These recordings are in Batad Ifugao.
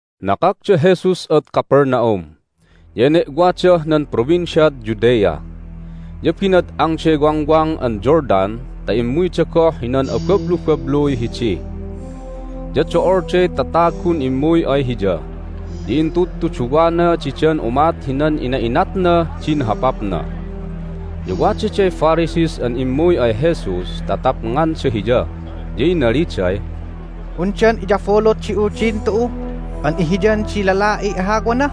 Nakak da Jesus ad Capernaum, ya ene'wadah nan Provinciad Judea. Ya binad'angday Wangwang an Jordan ta immuyda goh hinan abablubabluy hidi. Ya do'olday tatagun immuy ay Hiya, ya intudtuduwana didan umat hinan ina'inatnah din hopapna. Ya wadaday Pharisees an immuy ay Jesus ta tapnganda Hiya, ya inaliday, "Undan iyabulut di Uldin tu'u an ihiyan di lala'iy ahawana?"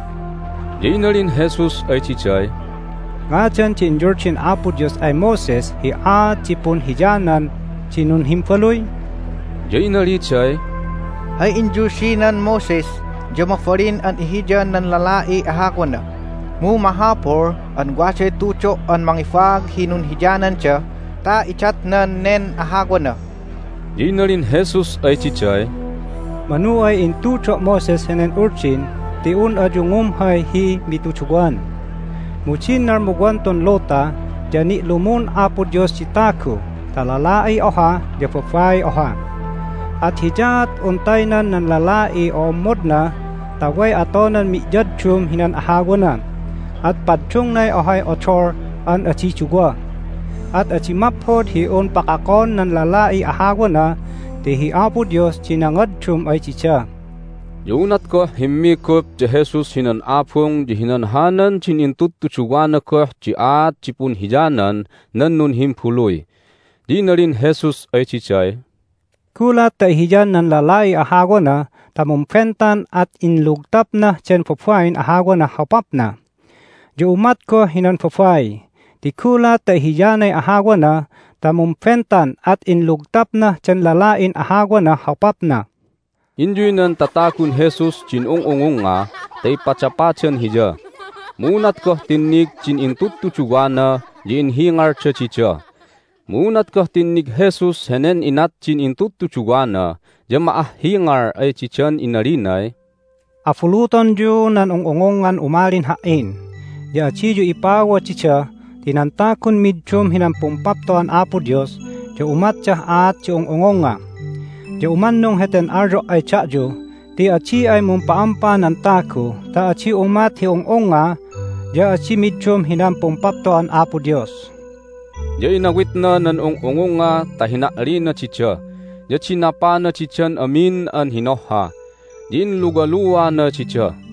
Ya inalin Jesus ay diday, "Ngadan di inyuldin Apo Dios ay Moses hi aat di punhiyanan di nunhimbaluy?" Ya inaliday, "Hay inyuldinan Moses ya mabalin an ihiyan nan lala'iy ahawana, mu mahapul an waday tudo' an mangibaag hi nunhiyananda ta idatnan nen ahawana." Ya inalin Jesus ay diday, "Manu ay intudo' Moses henen uldin ti un ayu ngumhay hi mituduwan! Mu din nalmuwan tun luta ya ni'lumun Apo Dios di tagu ta lala'iy oha ya babaiy oha. At hiyaat un taynan nan lala'iy o'ommodna ta way atonan mi'yaddum hinan ahawana, at paddungnay ohay odol an adi duwa. At adi maphod hi un pakakon nan lala'iy ahawana ti hi Apo Dios di nangaddum ay dida." Ya unat goh himmigup da Jesus hinan abung ya hinanhanan din intudtuduwana goh di aat di punhiyanan nan nunhimbaluy. Ya inalin Jesus ay diday, "Gulat ta ihiyan nan lalaiy ahawana ta mumbentan at inlugtapnah den babain ahawanah hopapna. Ya umat goh hinan babai, ti gulat ta ihiyanay ahawana ta mumbentan at inlugtapnah den lala'in ahawanah hopapna." Inyuy nan tatagun Jesus din ung'ungungnga ta ipadapadan Hiya. Mu unat goh tinnig din intudtuduwana ya inhingalda dida. Mu unat goh tinnig Jesus henen inat din intudtuduwana ya ma'ahhingal ay didan inalinay, "Abulutonyu nan ung'ungungngan umalin Ha"in! Ya adiyu ipawa dida ti nan tagun middum hinan Pumpapto'an Apo Dios ya umatdah aat di ung'ungungnga. Ya umannung heten alyo' ay da'yu ti adi ay mumpa'ampa nan tagu ta adi umat hi ung'ungnga ya adi middum hinan Pumpapto'an Apo Dios." Ya inawitna nan ung'ungungnga ta hina'lina dida, ya dinapana didan amin an hinohha, ya inluwaluana dida.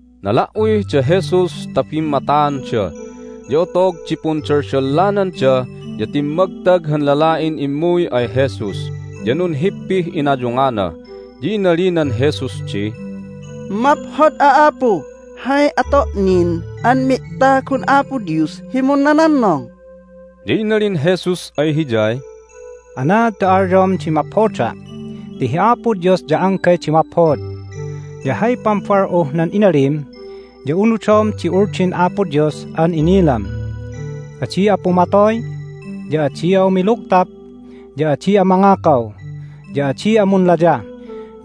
Nala"uy da Jesus ta bimmataanda, ya otog di pundaldallananda ya timmagtag han lala'in immuy ay Jesus, ya nunhippih inayungana, ya inalinan Jesus di, " Maphod'a, Apu! Hay ato' nin an mi'tagun Apo Dios hi munnanannong?" Ya inalin Jesus ay hiyay, "Anaad ta alyom di maphoda'? Ti hi Apo Dios ya anggay di maphod! Ya hay pambal'uh nan inalim ya unudom di Uldin Apo Dios an inilam: adi'a pumatoy, ya adi'a umilugtap, ya adi'a mangakaw, ya adi'a munlayah,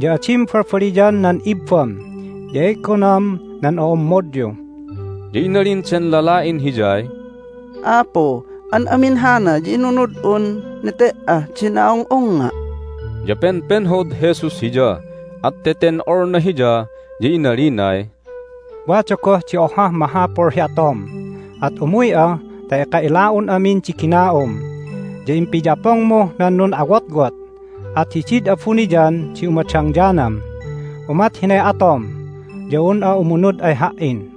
ya adim balbaliyan nan ibbam, ya e'gonam nan o'ommodyu." Ya inalin den lala'in Hiyay, "Apu, an amin hana ya inunud'un nete"ah din a'ung'ungnga'." Ya penpenhod Jesus hiya, at teten'olna hiya, ya inalinay, "Wada goh di ohah mahapul hi atom. At umuy'a ta eka ila'un amin di gina'um, ya impiyapongmuh nan nun'awotwot, at hidid abuniyan di umadangyanam. Umat hinay atom ya un'a umunud ay Ha"in."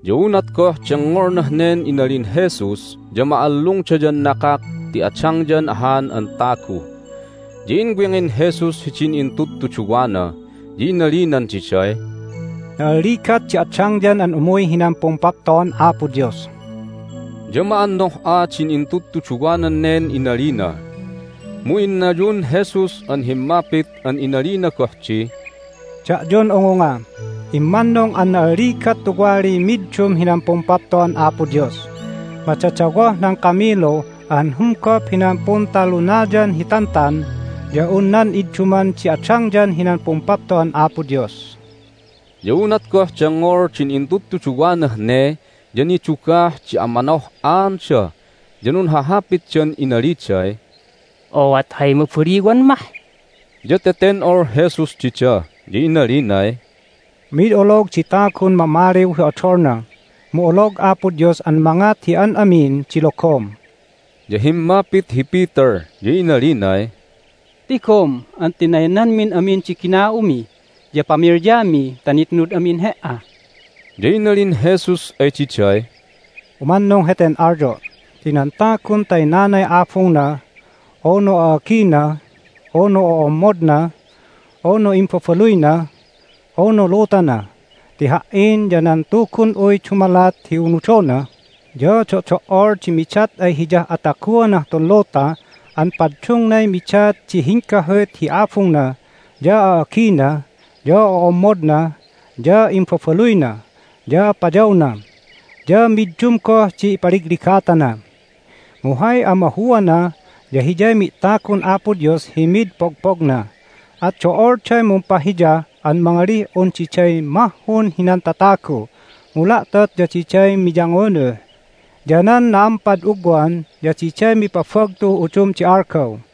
Ya unat goh dengngolnah nen inalin Jesus ya ma'allungdayan nakak ti adangyan ahan an tagu. Ya inwingin Jesus hidin intudtuduwana, ya inalinan diday, "Na'alligat di adangyan an umuy hinan Pumpapto'an Apo Dios!" Ya ma'annoh'a din intudtuduwanan nen inalina. Mu innayun Jesus an himmapit an inalina goh di, "Da'yun ungunga, immannung an na'alligat tuwaliy middum hinan Pumpapto'an Apo Dios! Madadawoh nan kamilu an humgop hinan Puntalunayan hi Tantan ya un nan idduman di adangyan hinan pumpapto'an Apo Dios." Ya unat goh dengngol din intudtuduwanah ne ya nidugah di amanoh'aanda, ya nunhahapitdan inaliday, "Ooat hay mabaliwan mah?" Ya teten'ol Jesus dida, ya inalinay, "Mid olog di tagun mamaliw hi odolna, mu olog Apo Dios an mangat hi an amin di logom." Ya himmapit hi Peter, ya inalinay, "Tigom an tinaynanmin amin di gina'umi ya pamilyami ta nitnud amin He"a!" Ya inalin Jesus ay diday, "Umannung heten alyo' ti nan tagun taynanay abungna, unu a'agina, unu o'ommodna, unu imbabaluyna, unu lutana ti Ha"in ya nan Tugun'uy dumalat hi unudona ya do'do"ol di midat ay hiyah ataguanah tun luta an paddungnay midat di hinggahut hi abungna, ya a'agina, ya o'ommodna, ya imbabaluyna, ya payawna. Ya middum goh di ipaligligatana. Mu hay amahuana ya hiyay mi'tagun Apo Dios hi mid pogpogna. At do'olday mumpahiya an mangalih un diday mahhun hinan tatagu, mu la'tot ya diday miyangunuh, ya nan na'ampad ugwan ya diday mipabagtuh udum di algaw."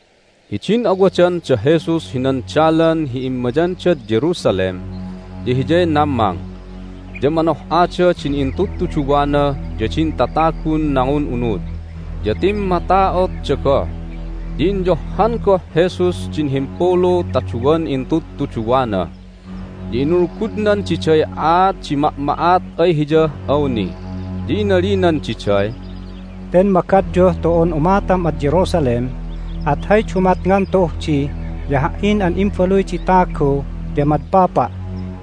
Hidin awadan da Jesus hinan dalan hi immayandad Jerusalem ya Hiyay nammang. Ya manoh'ada din intudtuduwana ya din tatagun nangun'unud, ya timmata'otda goh. Ya inyohhan goh Jesus din himpulu ta duwan intudtuduwana, ya inulgudnan diday aat di ma'ma'at ay Hiyah awni. Ya inalinan diday, "Ten magadyuh tu'un umatam ad Jerusalem, at hay dumatngan tu'uh di ya Ha"in an Imbaluy di Tagu ya madpapa',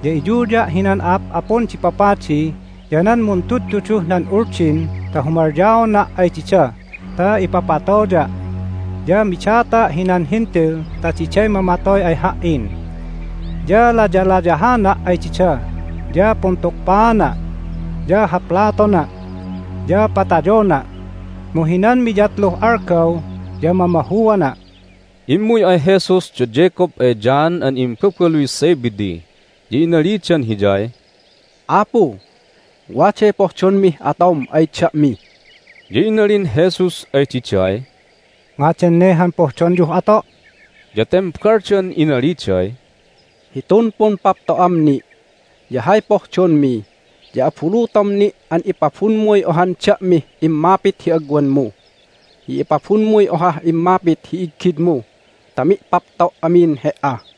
ya iyuya' hinan a'ap'apun di papadi ya nan muntudtuduh nan Uldin ta humalyaona' ay dida ta ipapatoya'. Ya midata' hinan Hentil ta diday mamatoy ay Ha"in. Ya layalayahana' ay dida, ya puntukpaana', ya haplatona', ya patayona'. Mu hinan miyatluh algaw ya mamahuana'." Immuy ay Jesus da Jacob ay John an imbabaluy Zebedee, ya inalidan Hiyay, "Apu, waday pohdonmih atom ay da'mi." Ya inalin Jesus ay diday, "Ngadan ne han pohdonyuh ato'?" Ya tembaldan inaliday, "Hitun pumpapto'am ni' ya hay pohdonmi ya abulutom ni' an ipabunmuy ohan da'mih immapit hi agwanmu, ya ipabunmuy ohah immapit hi iggidmu ta mi'papto' amin He"a."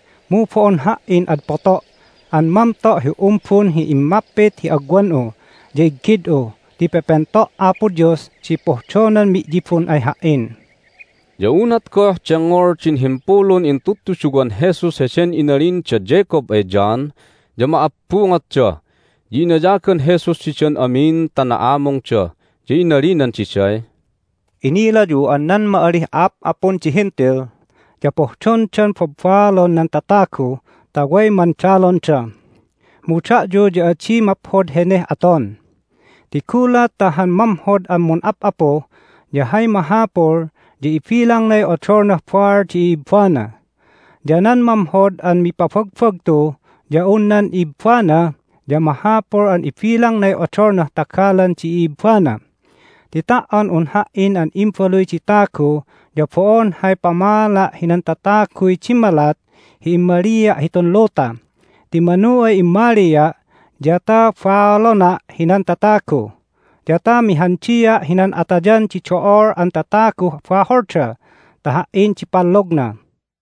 Mu bo'on Ha"in ad poto' an mamto' hi umbun hi immapit hi agwan'u ya iggid'u ti pepento' Apo Dios di pohdonan mi'yibun ay Ha"in." Ya unat goh dengngol din himpulun intudtuduwan Jesus heden inalin da Jacob ay John ya ma'abbungotda. Ya inayagan Jesus didan amin ta na'amungda, ya inalinan diday, "Inilayu an nan ma'alih a'ap'apun di Hentil ya pohdondan babbaalon nan tatagu ta way mandalonda. Mu da'yu ya adi maphod heneh aton, ti gulat ta han mamhod an mun'ap'apu ya hay mahapul ya ibilangnay odolnah baal di i'ibbana. Ya nan mamhod an mipabagbagtu ya un nan ibbana ya mahapul an ibilangnay odolnah tagalan di i'ibbana. Ti ta"on un Ha"in an Imbaluy di Tagu ya bo'on hay pamaala' hinan tataguy dimmalat hi immalia' hitun luta, ti manu ay immalia' ya ta baalona' hinan tatagu, ya ta mihandia' hinan atayan di do'ol an tataguh baholda ta Ha"in di pallogna."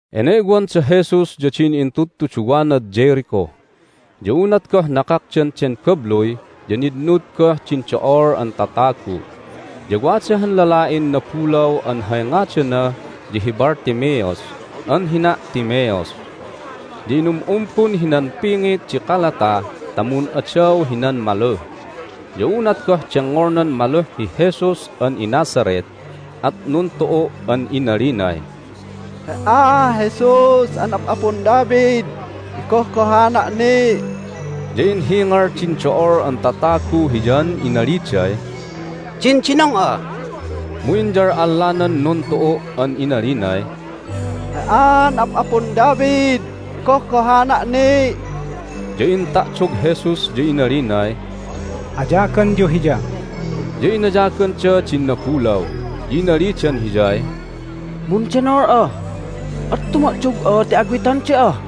Ene'wan da Jesus ya din intudtuduwanad Jericho. Ya unat goh nakakdan den babluy ya nitnud goh din do'ol an tatagu. Ya wada han lala'in nabulaw an hay ngadana ya hi Bartimaeus an hina' Timaeus, ya inum'umbun hinan pingit di kalata ta mun'adaw hinan maluh. Ya unat goh dengngolnan maluh hi Jesus an iNazareth at nuntu'u' an inalinay, "He"a, Jesus an Ap'apun David, igohgohana' ni'!" Ya inhingal din do'ol an tatagu hiyan inaliday, "Dindinong'a!" Mu inyal'allanan nuntu'u' an inalinay, "He"an Ap'apun David, igohgohana' ni'!" Ya inta'dog Jesus, ya inalinay, "Ayaganyu hiya." Ya inayaganda din nabulaw, ya inalidan hiyay, "Mundenol'a, at tuma'dog'a ti awiton da'a."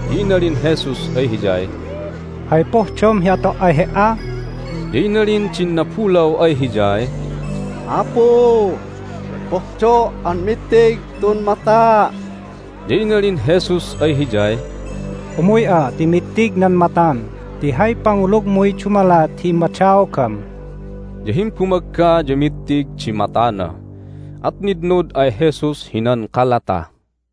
Ya inalin Jesus ay hiyay, "Hay pohdom hi ato' ay he"a?" Ya inalin din nabulaw ay Hiyay, "Apu, pohdo' an mittig tun mata'!" Ya inalin Jesus ay hiyay, "Umuy'a ti mittig nan matam ti hay pangulugmuy dumalat hi immadaogam." Ya himbumagga ya mittig di matana, at nitnud ay Jesus hinan kalata.